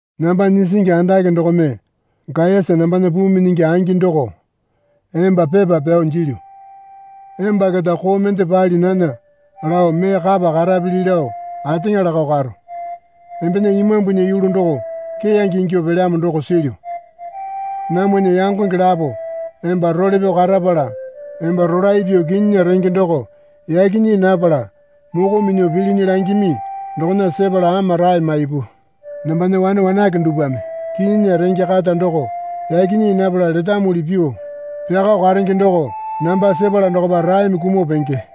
Namba nyisingi andake dokome Gayasa nambana puu minyingi angi doko emba pepa pyao jilyu. Emba keta koo mende pali nana lao mee kapa karapili lao ateŋa lakao karo. Embena imambunya yulu doko keyange ingyuo pelyamo doko silyu. Namwana yangonge lapo emba role pyao karapala emba rolae pyuo kinyinya renge doko yaki nyii napala moko minyuo pilinyi langimi dokona sepala ama rae maipu. Nambana wane wanake dupwame kinyinya renge kata doko yaki nyii napala letamuli pyuo pyakao karenge doko namba sepala dokopa raeme kumuo penge.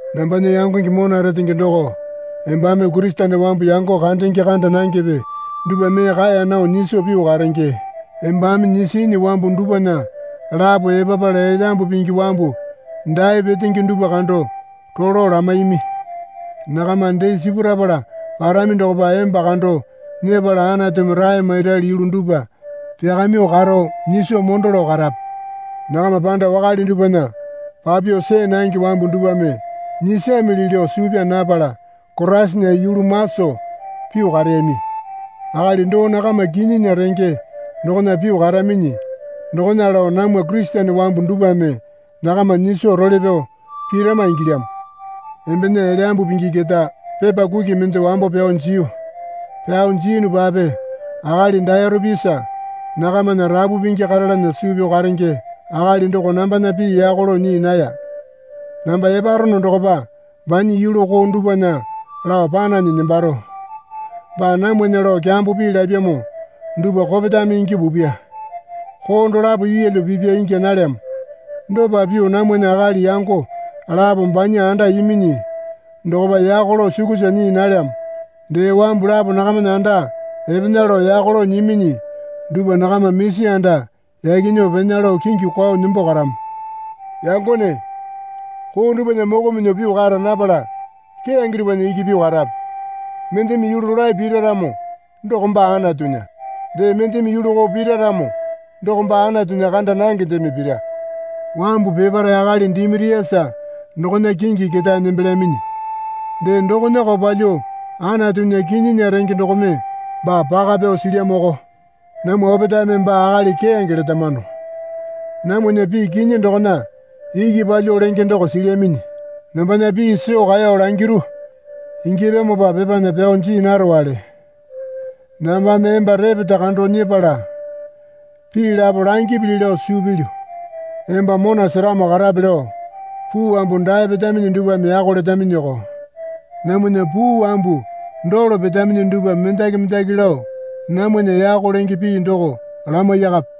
Nambana yangonge mona retenge doko embame Kurisene wambu yango kandenge kanda nangepe dupwa mee kaeya nao nyiso pyuo karenge. Embame nyisinyi wambu dupwana lapo epapala Elyambu Pingi wambu dae petenge dupwa kando rolo lamaimi. Nakama dee sipurapala parami dokopa emba kando nyepala Anatumi rae mairali yulu dupwa pyakamyuo karo nyiso mondo lao karape. Nakama panda wakale dupwana papyuo see nange wambu dupwame nyisamili lao suu pyaa napala Koraisana yulu maso pyuo kareyami. Akali doo nakama kinyinya renge dokona pyuo karaminyi dokona lao namwa Kurisene wambu dupwame nakama nyiso role pyao pirama ingilyamo. Embena Elyambu Pingi keta pepa kuki mende wambo pyao jiyu. Pyao jiyunupape akali Dayorepisa nakamana rapu pingi karalana suu pyao karenge akali doko nambana pii yako lao nyii naya. Namba eparono dokopa banya yulu koo dupwana lao pananyi nembaro. Baa namwana lao kyambo pii lapyamo dupwa kopetame ingyuo pupya. Koo dolapo yeelyo pipya ingya nalyamo. Dopa pyuo namwana akali yango lapo banya anda iminyi dokopa yako lao sukusa nyii nalyamo. Dee wambu lapo nakamana anda epena lao yako lao nyiminyi dupwa nakama misi anda yaki nyuo pena lao kingi kwao nembo karamo. Yangone, koo dupwana moko minyuo pyuo kara napala keyange dupwana iki pyuo karape. Mendeme yulu rolae pira ramo doko baa Anatunya. Dee mendeme yulu koo pira ramo doko baa Anatunya kanda nangendeme pira. Wambu peparae akali Dimiriasa dokona kingi ketae nembelyaminyi. Dee dokonako palyuo Anatunya kinyinya renge dokome baa paka pyao silyamoko. Namwa opetaeme baa akali keyange letamano. Namwana pii kinyi dokona iki palyuo lenge doko silyaminyi. Nambana pii soo kaeyo langiru ingyapyamopa pepana pyao jii narowale. Nambame emba repeta kando nyepala pii lapo langipili lao suu pilyu. Emba mona seramo karape lao puu wambu dae petaminyi dupwame yako letaminyoko. Namwana puu wambu dolo petaminyi dupwa mendaki mendaki lao namwana yako lenge pii doko lamaiyakape.